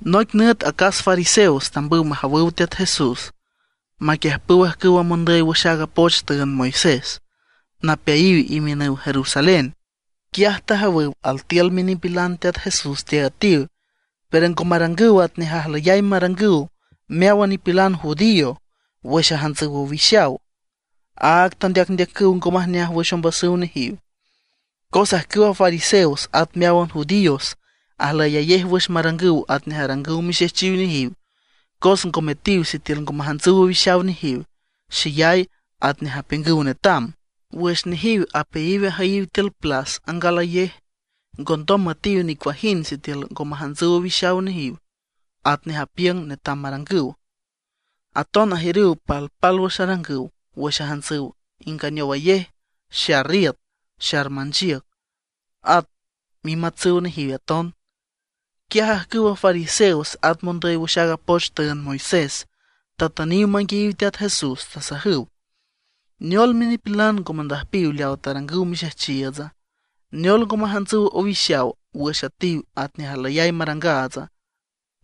Noic nüt acas fariseos tambüw majawüw Teat Jesús, maquiüjpüw ajcüwa mondüy wüx aaga poch tüünd Moisés, napeayiw imiünüw Jerusalén. Quiaj tajawüw altiül minipilan Teat Jesús teaüetiw; pero ngo marangüw atnej ajlüyay marangüw meáwan nipilan judío wüx ajantsüw owixaw. Áag tandeacndeacüw ngo majneaj wüx ombasüw nejiw. (Cos ajcüwa fariseos at meáwan judíos ajlüyayej wüx marangüw atnej arangüw mixejchiw nejiw, cos ngo metiw sitiül ngo majantsüw owixaw nejiw xeyay atnej apiüngüw netam. Wüx nejiw apeayiw ajüyiw tiül plas angalayej, ngondom müetiw nicuajind sitiül ngo majantsüw owixaw atnej apiüngüw netam marangüw. Aton ajiürüw palpálwüx arangüw wüx ajantsüw inganeowayej, xar iüt, xar manchiüc, at mimatsüw nejiw aton.) Quiaj ajcüwa fariseos at mondüy wüx aaga poch tüünd Moisés, tatüniw manguiayiw Teat Jesús. Tasajüw: ―¿Neol minipilan ngo mandüjpiw leaw tarangüw mixejchiiütsa? ¿Neol ngo majantsüw owixaw wüx üetiw atnej ajlüyay marangaatsa?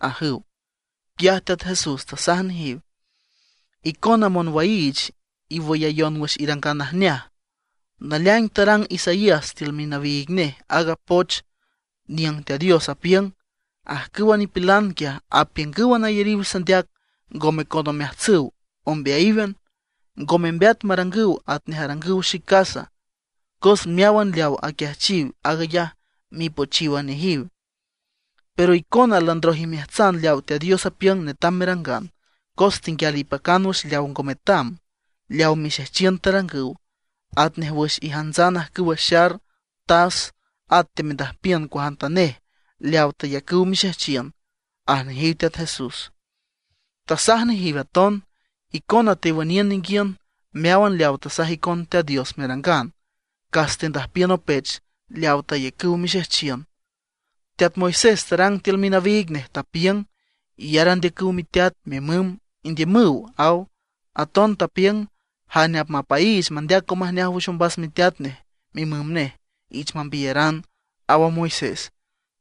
―ajüw. Quiaj Teat Jesús tasaj nejiw: ―Icona monwaiich, iwüyayon wüx irangan najneaj, naleaing tarang Isaías tiül minawiig nej aaga poch niüng Teat Dios tapiüng: Ajcüwa nipilan quiaj apiüngǘwan ayariw sandeac, ngome con omeajtsüw, ombeayíwan. Ngo membeat marangüw atnej arangüw xic casa, cos meáwan leaw aquiajchiw, aag ayaj mipochíwan nejiw. Pero icona landroj imeajtsan leaw Teat Dios apiüng netam merangan, cos tenguial ipacan wüx leaw ngo metam, leaw mixejchiün tarangüw. Atnej wüx ijantsan ajcüwa xar, tas, at teamendüjpiün cuajantanej leawa tayacüw mixejchiün, aj nejiw Teat Jesús. Tasaj nejiw aton: ―Icona tewüniün ninguiün meáwan leawa tasaj icon Teat Dios merangan, cas tendüjpiün opech leawa tayacüw mixejchiün. Teat Moisés tarang tiül minawiig nej, tapiüng: “Iyar andeacüw miteat, mimüm, indiümüw”, aw. Aton tapiüng: “Jane apmapaiich mandeac ngo majneaj wüx ombas miteat nej, mimüm nej, ich mambiyaran”, aw a Moisés.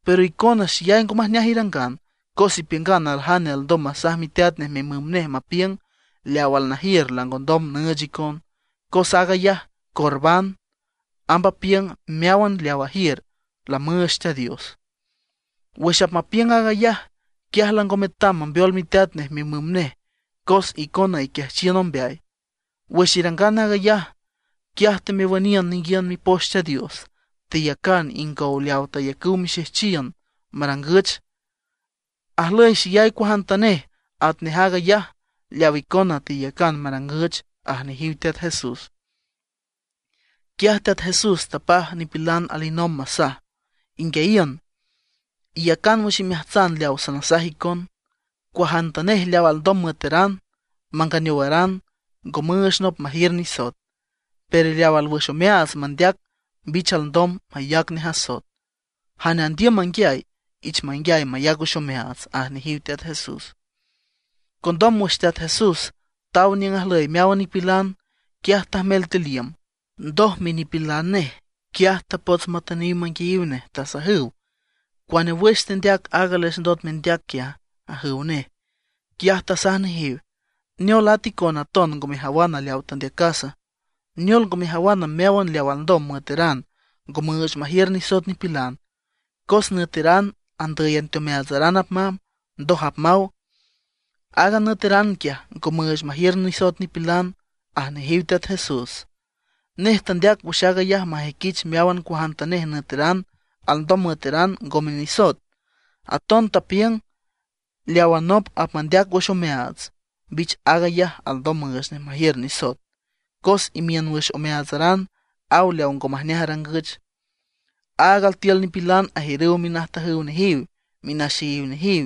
Pero icona xeyay ngo majneaj irangan, cos ipiüngan aljane alndom masaj miteat nej, mimüm nej, mapiüng: “Leawa alnajiür langondom nüüch icon, cos aag ayaj Corbán”. (Amb apiüng meáwan leaw ajiür lamüüch Teat Dios.) Wüx apmapiüng aag ayaj, quiaj lango metam mambeol miteat nej mimüm nej cos icona iquiajchiün ombeay. Wüx irangan aag ayaj, quiaj temewüniün ninguiün Mipoch Teat Dios, teyacan ingow leawa tayacüw mixejchiün marangüch. Ajlüy xeyay cuajantanej atnej aag ayaj leaw icona teyacan marangüch ―aj nejiw Teat Jesús. Quiaj Teat Jesús tapaj nipilan alinomb masaj: ―Inguiayiün, iyacan wüx imeajtsan leaw sanasaj icon. Cuajantanej leaw alndom müeteran, manganeowaran ngo müüch nop majiür nisoet; pero leawa alwüx omeaats mandeac mbich alndom mayac nej asoet. Jane andiüm manguiay, ich manguiay mayac wüx omeaats ―aj nejiw Teat Jesús. Condom wüx Teat Jesús taw niüng ajlüy meáwan nipilan, quiaj tajmel tiül iüm. Ndoj minipilan nej quiaj tapots matüniw manguiayiw nej, tasajüw: ―¿Cuane wüx tendeac aaga les ndot mendeac quiaja? ―ajüw nej. Quiaj tasaj nejiw: ―¿Neol, ata icona aton ngo mejawan leawa tandeacas? ¿Neol ngo mejawana, meáwan leaw alndom müeteran ngo müüch majiür nisoet nipilan? Cos nüeteran andǘyan teomeaatsaran apmamb, ndoj apmaw. Aaga nüeteran quiaj ngo müüch majiür nisoet nipilan ―aj nejiw Teat Jesús. Nej tandeac wüx aag ayaj majüiquich meáwan cuajantanej nüeteran alndom müeteran, ngome nisoet. Aton tapiüng: ―Leawa nop apmandeac wüx omeaats, mbich aag ayaj alndom müüch nej majiür nisoet. Cos imiün wüx omeaatsaran aw leaw ngo majneaj arangüch. Áag altiül nipilan ajiürüw minajtajüw nejiw, minaxeyiw nejiw,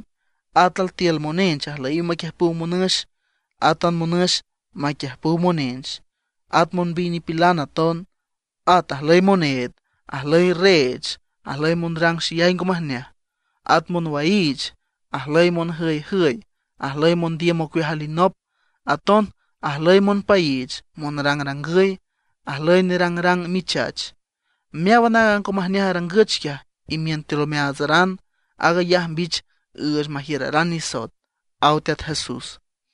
at altiül monench ajlüyiw maquiüjpüw monüx, átan monüx maquiüjpüw monench, at monbiy nipilan aton. At ajlüy moneed, ajlüy reech, ajlüy monrang xeyay ngo majneaj, at monwaiich, ajlüy monjüyjüy, ajlüy mondiüm ocueaj alinop. Aton ajlüy monpaiich, monrangrangüy, ajlüy nerangrang michach. Meáwan aaga ngo majneaj arangüch quiaj, imiün tiül omeaatsaran. Aag ayaj mbich üüch majiüraran nisoet ―aw Teat Jesús.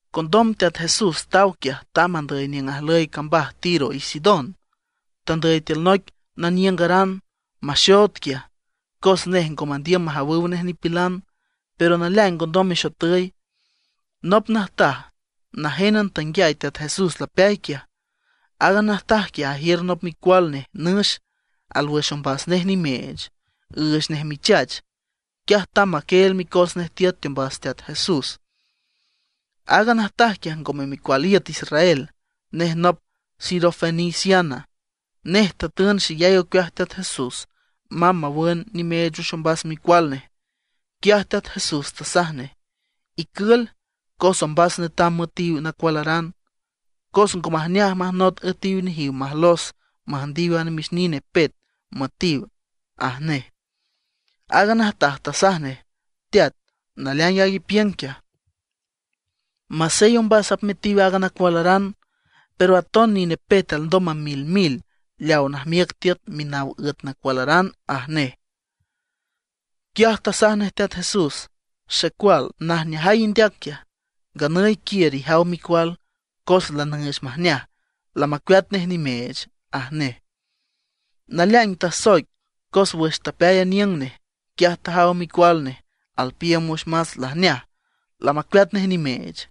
Condom Teat Jesús taw quiaj tamb andüy niüng ajlüy cambaj Tiro y Sidón. Tandüy tiül noic naniüngaran, maxood quiaj, cos nej ngo mandiüm majawüw nej nipilan. Pero naleaing ngondom mexotüy. Nop najtaj najénan tanguiay Teat Jesús lapeay quiaj. Aaga najtaj quiaj ajiür nop micual nej nüx, alwüx ombas nej nimeech, üüch nej michach. Quiaj tamb maquieel micos nej tiüt teombas Teat Jesús. Aaga najtaj quiaj ngome micual iüt Israel, nej nop sirofeniciana. Nej tatün xeyay ocueaj Teat Jesús mamb mawün nimeech wüx ombas micual nej. Quiaj Teat Jesús tasaj nej: ―Icül, cos ombas netam metiw nacualaran, cos ngo majneaj majnot üetiw nejiw majlos müjndiw a namix nine pet müetiw ―aj nej. Aaga najtaj tasaj nej: ―Teat, naleaing aag ipiüng quiaj, masey ombas apmetiw a nacualaran, pero aton nine pet alndom mamilmil leawa najmiüc tiüt minaw üet nacualaran ―aj nej. Quiaj tasaj nej Teat Jesús: ―Xecual, najneajay indeac quiaj. Nganüy quiür ijaw micual, cos lanüüch majneaj, lamacueat nej nimeech ―aj nej. Naleaing tasoic, cos wüx tapeay aniüng nej, quiaj tajaw micual nej alpiiüm wüx mats, lajneaj, lamacueat nej nimeech.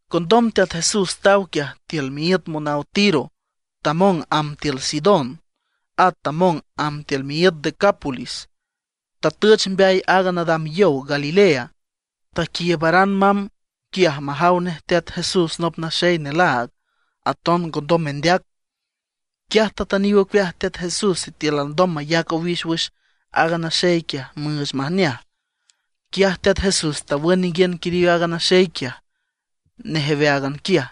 Condom Teat Jesús taw quiaj tiül miíüt monaw Tiro, tamong amb tiül Sidón, at tamong amb tiül miíüt Decápolis, tatüch mbeay aaga nadam yow Galilea. Taquiiübaran mamb quiaj majaw nej Teat Jesús nop naxey nelaag, aton ngondom mendeac. Quiaj tatüniw ocueaj Teat Jesús sitiül alndom mayac owix wüx aaga naxey quiaj müüch majneaj. Quiaj Teat Jesús tawün ninguiün quiriw aaga naxey quiaj nejeweáagan quiaj.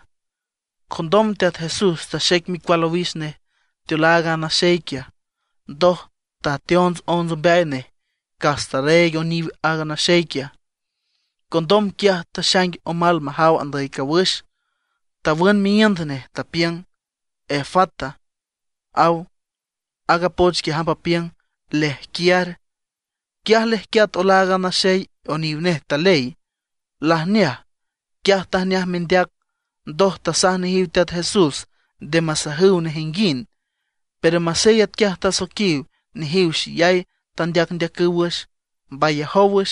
Condom Teat Jesús taxec micual owix nej teolaag a naxey quiaj, ndoj tateonts onts ombeay nej cas tarreeg oniw a naxey quiaj. Condom quiaj taxaing omal majaw andüy cawüx, tawün miíünd nej, tapiüng: ―¡Efata! ―aw. Aaga poch quiaj amb apiüng: ¡Lejquiar! Quiaj lejquiat olaag a naxey y oniw nej taley, lajneaj. Quiaj tajneaj mendeac. Ndoj tasaj nejiw Teat Jesús nde masajüw nejinguind. Pero masey atquiaj tasoiquiw, nejiw xeyay tandeacndeacüw wüx. Mbayajow wüx,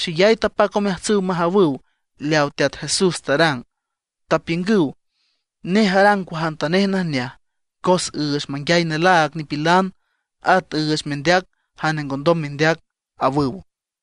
xeyay tapac omeajtsüw majawüw leaw Teat Jesús tarang, tapiüngüw: ―Nej arang cuajantanej najneaj, cos üüch manguiay nelaag nipilan, at üüch mendeac jane ngondom mendeac ―awüw.